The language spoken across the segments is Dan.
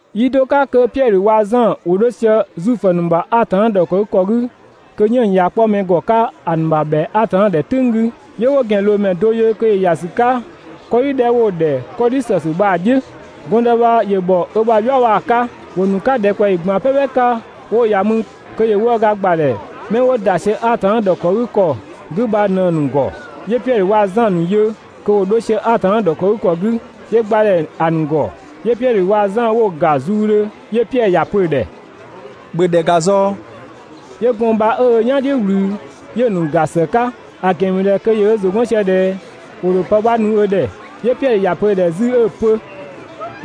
Yi do 'ka kö Piɛdhö waa‑ Zan ‑wo 'dho sië Zuifö ‑nu ‑bha Atanna ‑dhɔkëgükɔ 'gü kö 'yënng‑ ꞊ya 'kpɔ mɛ ‑gɔ 'ka ‑a ‑nu ‑bha ‑bhɛa Atanna ‑dhɛ "tʋ̈ng 'gü, 'yö 'wo ‑gɛnloomɛ do yö kö ‑yö ‑ya ‑sü 'ka 'kɔdhi 'dhɛ 'wo‑ ‑dhɛ 'kɔdhi ‑sësü bha‑ "dhiʋ̈. Gɔndë bha ‑yö ‑bhɔ ö ‑bha "yua bha‑ 'ka. ‑Wo ‑nu 'ka ‑dhɛkpaɔyi ꞊gban "pɛpɛ 'ka 'wo‑ ‑ya mü kö ‑yö 'wëëga ‑gbadhɛ 'mɛ 'wo ‑da sië Atanna ‑dhɔkëgükɔ 'gü bha ꞊në‑ ‑nu ‑gɔ. 'Yö Piɛdhö waa‑ Zan ‑nu yö kö ‑wo 'dho sië Atanna ‑dhɔkëgükɔ 'gü, 'yö gba ‑dhɛ ‑a ‑nu ‑gɔ. 'Yö Piɛdhö waa‑ Zan 'wo‑ ‑ga zuudhö, 'yö Piɛdhö ‑ya pö‑ ‑dhɛ: «‑Bhö ‑dhɛ ‑ga ꞊zɔɔ!» 'Yö gɔɔn‑ bha 'ö ö "yan "dhiʋ̈ ꞊wlü 'yö‑ ‑nu ‑ga ‑së 'ka, ‑a ‑gɛn ‑mü ꞊dhɛ kö ‑yö ö ‑zʋ 'gɔn sië ꞊dhɛ ‑wo ‑dho pë 'bha nu ö ‑dhɛ. 'Yö Piɛdhö ‑ya pö‑ ‑dhɛ 'zü 'ö‑ pö: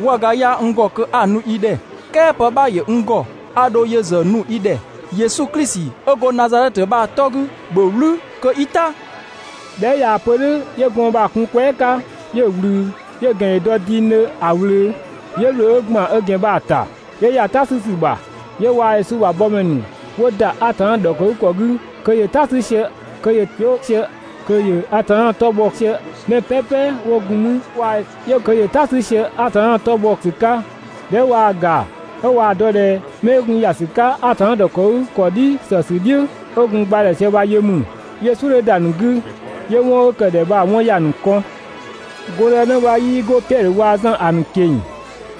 «'Wëëga 'yaa n ‑gɔ kö 'a‑ nu i ‑dhɛ "kɛɛ pë 'bha ‑yö n ‑gɔ, a ‑dho yö ‑zë nu i ‑dhɛ: Yesu Klisi 'ö go Nazadhɛtö bha‑ 'tɔ 'gü, ‑bhö "wlü kö 'i "ta!» ꞊Dhɛ 'ö ꞊yaa‑ pö "dhʋ̈ 'yö gɔɔn‑ bha‑ kun‑ kwɛɛ" 'ka, 'yö‑ ꞊wlü, 'yö‑ ‑gɛn ‑yö dɔ dingdhö ‑a ꞊wlöö, 'yö ‑wlö 'ö ‑gban ö ‑gɛn bha‑ ‑ta, 'yö ‑ya "ta 'sü ‑sü ‑bha. 'Yö waa‑ Yesu ‑bha bɔmɛ ‑nu 'wo ‑da Atanna ‑dhɔkëgükɔ 'gü kö ‑yö "ta 'sü sië, kö ‑yö ‑wlö sië, kö ‑yö Atanna 'tɔ bhɔ sië. Mɛ "pɛpɛ 'wo gun 'mü ‑wa ‑yö kö ‑yö "ta 'sü sië Atanna 'tɔ bhɔ ‑sü 'ka. ꞊Dhɛ 'ö ꞊waa‑ ‑ga 'ö ꞊waa‑ dɔ ꞊dhɛ 'mɛ 'ö gun ‑ya ‑sü 'ka Atanna ‑dhɔkëgükɔ "dhi ‑sësü "dhiʋ̈, 'ö gun gba ‑dhɛ sië bha yö mü, 'yö "suʋ̈ 'dhö ‑da ‑nu 'gü 'yö 'wɔn 'ö ‑kë ‑dhɛ bha‑ 'wɔn ‑ya ‑nu kɔn. Gɔndënë bha 'yii go Piɛdhö waa‑ Zan ‑a ‑nu ꞊keng‑,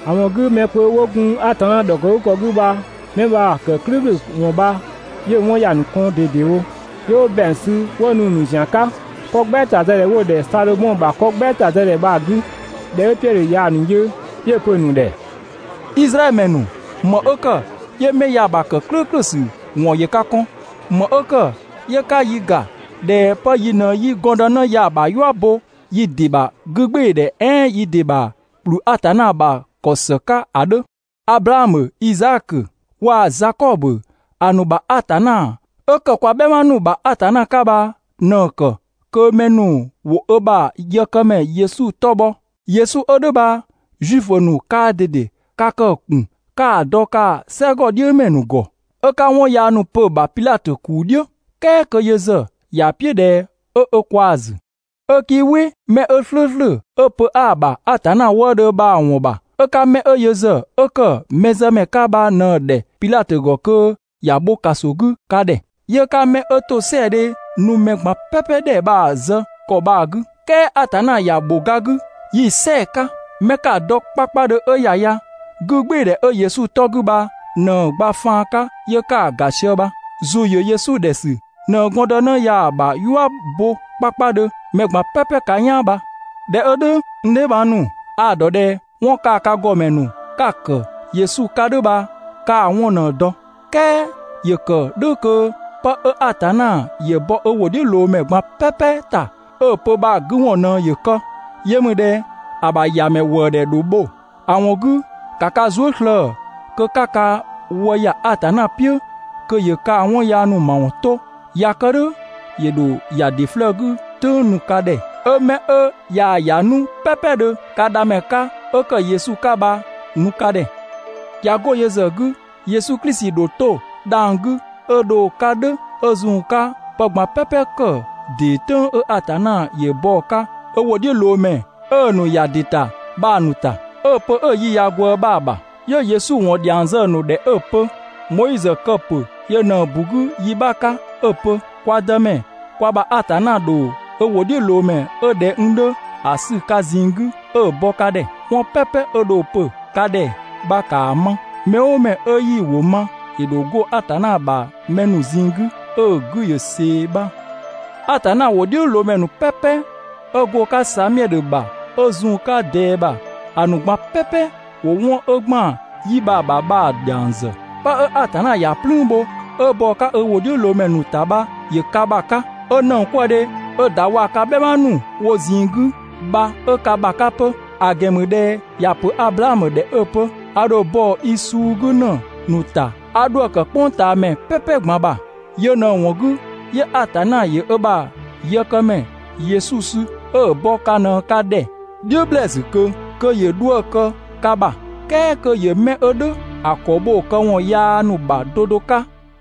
‑a ‑wɔn 'gü mɛ kpö 'wo gun Atanna ‑dhɔkëgükɔ 'gü bha 'mɛ bha‑ ‑kë "klʋ̈ʋ̈klʋ̈ ‑wɔn bha 'yö‑ 'wɔn ‑ya ‑nu kɔn ꞊dedewo, 'yö 'wo ‑bɛang sü 'wo nu‑ ‑nu ‑zian 'ka 'kɔ "gbɛɛtazëdhɛ 'dhɛ 'wo‑ ‑dhɛ Sadhomɔ ‑bha 'kɔ "gbɛɛtazëdhɛ bha‑ 'gü. ꞊Dhɛ 'ö Piɛdhö ꞊yaa‑ ‑nu yö, 'yö‑ pö‑ ‑nu ‑dhɛ: «Izraɛdhö ‑mɛ ‑nu, ‑më 'ö ‑kë 'yö 'mɛ ya‑ ‑kë "klʋ̈ʋ̈klʋ̈ ‑sü ‑wɔn ‑yö ka kɔn? ‑Më 'ö ‑kë 'yö 'ka yi ‑ga ꞊dhɛ 'pë yi ꞊në 'yi gɔndënë ya‑ ‑bha "yua bo yi ‑dɩ ‑bha 'gügbɩɩdhɛ "ɛɛn yi ‑dɩ ‑bha ‑kplü Atanna ‑bha ‑kɔ ‑së 'ka ‑a 'dhö? Ablaamö, Izaakö waa‑ Zakɔbö ‑a ‑nu ‑bha Atanna 'ö ‑kë kwa "bhɛma ‑nu ‑bha Atanna 'ka bha ꞊në‑ ‑kë kö mɛ ‑nu ‑wo ö ‑bha yëkëmɛ Yesu 'tɔ bhɔ ('yö‑ ‑bö 'ö‑ bho ga 'gü). Yesu 'ö "dhʋ̈ bha Zuifö ‑nu kaa ꞊dede ka kë‑ ‑kun 'ka‑ dɔ kaa‑ "sɛgɔdhiʋ̈mɛ ‑nu ‑gɔ, 'ö 'ka 'wɔn yaa ‑nu pö‑ ‑bha Pidhatö ‑kuu "dhiʋ̈, "kɛɛ kö yö ‑zë ‑ya "piʋ̈ ꞊dhɛ 'ö ö kwaa‑ ‑zü. 'Ö 'kii "wɩ mɛ 'ö "slʋ̈ʋ̈slʋ̈, 'ö pö 'aa‑ ‑bha Atanna wëëdhö bha‑ ‑wɔn ‑bha, 'ö 'ka 'mɛ yö ‑zë 'ö ‑kë mɛzëmɛ 'ka bha ꞊në‑ ‑dhɛ Pidhatö ‑gɔ kö ‑ya bho ‑kaso 'gü ka ‑dhɛ. 'Yö 'ka 'mɛ 'ö ‑tosɛadhe nu mɛ ꞊gban "pɛpɛ ‑dhɛ bha‑ zë ‑kɔ bha‑ 'gü. "Kɛɛ Atanna ‑ya ‑bho ga 'gü, yi‑ "sɛɛ‑ 'ka. 'Mɛ 'ka‑ dɔ 'kpakpadhö 'ö ‑ya ya, 'gügbɩɩdhɛ 'ö Yesu 'tɔ 'gü bha ꞊në‑ gba faan 'ka 'yö 'ka‑ ‑ga sië bha. ‑Zʋ ‑yö Yesu ‑dhɛ ‑sü ꞊në gɔndënë ya‑ ‑bha "yua bo 'kpakpadhö mɛ ꞊gban "pɛpɛ ka "yaan bha. ꞊Dhɛ 'ö "dhʋ̈, n dheebhang ‑nu, 'a‑ ‑dɔ ꞊dhɛ 'wɔn kaa‑ ka ‑gɔmɛ ‑nu 'ka‑ ‑kë Yesu 'ka "dhʋ̈ bha 'kaa‑ 'wɔn ꞊në‑ dɔ. "Kɛɛ ‑yö ‑kë "dhʋ̈ kö 'pë 'ö Atanna ‑yö bɔ ö ‑wʋdhiʋ̈loomɛ ꞊gban "pɛpɛ ‑ta 'ö‑ pö bha‑ 'gü ‑wɔn ꞊në ‑yö kë. Yö ‑mü ꞊dhɛ ‑a ‑bha ‑Yamɛ ‑wëëdhɛ ‑dho bho. ‑A ‑wɔn 'gü, ‑ka ka zuë" slëë‑ kö 'ka ka wë ‑ya Atanna "piʋ̈ kö ‑yö kaa‑ 'wɔn yaa ‑nu ‑mawɔn 'to. ꞊Ya kë "dhʋ̈, ‑yö ‑dho ‑ya ‑dɩ 'flëë‑ 'gü "tʋ̈ng nu ka ‑dhɛ, 'ö 'mɛ 'ö ꞊yaa‑ ‑ya 'nu "pɛpɛdhö ka Dhamɛ 'ka 'ö ‑kë Yesu 'ka bha‑ nu ka ‑dhɛ. ꞊Ya 'go yö ‑zë 'gü, Yesu Klisi ‑dho 'to dhang‑ 'gü 'ö dho‑ 'ka "dhʋ̈ 'ö zun‑ 'ka pë ꞊gban "pɛpɛ kë ‑dee "tʋ̈ng 'ö Atanna ‑yö bɔ‑ 'ka ö ‑wʋdhiʋ̈loomɛ 'ö‑ ‑nu ‑ya ‑dɩ ‑ta bha‑ ‑nu ‑ta, 'ö‑ pö 'ö‑ yi ꞊ya ꞊gwëë bha‑ ‑bha. 'Yö Yesu ‑wɔn dhiang zë‑ ‑nu ‑dhɛ 'ö‑ pö: «Moizö kë‑ ‑pö yö ꞊në‑ ‑bu 'gü yi 'bha 'ka 'ö‑ pö: ‹Kwa Dëmɛ, kwa ‑bha Atanna ‑dho ö ‑wʋdhiʋ̈loomɛ 'ö ꞊dhɛ n 'dhö ‑a sü ka ꞊zinng 'gü 'ö‑ bɔ ka ‑dhɛ. 'Wɔn "pɛpɛ 'ö dho‑ pö ka ‑dhɛ bha ‑kaa ma! Mɛ "ʋʋ mɛ 'ö 'yii‑ ‑wʋ ma, ‑yö ‑dho 'go Atanna ‑bha mɛ ‑nu ꞊zinng 'gü 'ö‑ 'gü ‑yö ꞊see› bha.» Atanna ‑wʋdhiʋ̈loomɛ ‑nu "pɛpɛ 'ö go‑ 'ka Samiɛdhö ‑bha 'ö zun‑ 'ka ꞊dɛɛ ‑bha, ‑a ‑nu ꞊gban "pɛpɛ ‑wo 'wɔn 'ö ‑gban 'yi bha‑ ‑bha bha‑ ‑dhiang ‑zë. 'Pë 'ö Atanna ‑ya "plüün bho 'ö bɔ‑ 'ka ö ‑wʋdhiʋ̈loomɛ ‑nu ‑ta bha ‑yö ka ‑bha 'ka, 'ö ‑nëngkwëëdhe 'ö‑ ‑da waa‑ ka "bhɛma ‑nu wo ꞊zinng 'gü bha 'ö ka ‑bha 'ka 'pö. ‑A ‑gɛn ‑mü ꞊dhɛ ‑ya ‑pö Ablaamö ‑dhɛ 'ö‑ pö: ‹A ‑dho bɔ i suu 'gü ‑në ‑nu ‑ta 'a 'dhuë‑ ‑kë "kpʋngtaamɛ "pɛpɛ ꞊gban ‑bha›. Yö ꞊në‑ ‑wɔn 'gü, 'yö Atanna ‑yö ö ‑bha yëkëmɛ (Yesu) sü 'ö‑ bɔ ka ꞊në ka ‑dhɛ "dhiʋ̈ ‑blɛɛsü ꞊kö kö ‑yö 'dhuë‑ kë ka ‑bha, "kɛɛ kö ‑yö 'mɛ 'ö "dhʋ̈ ‑a ‑kɔ bho‑ këwɔn yaa ‑nu bha 'do 'do 'ka.»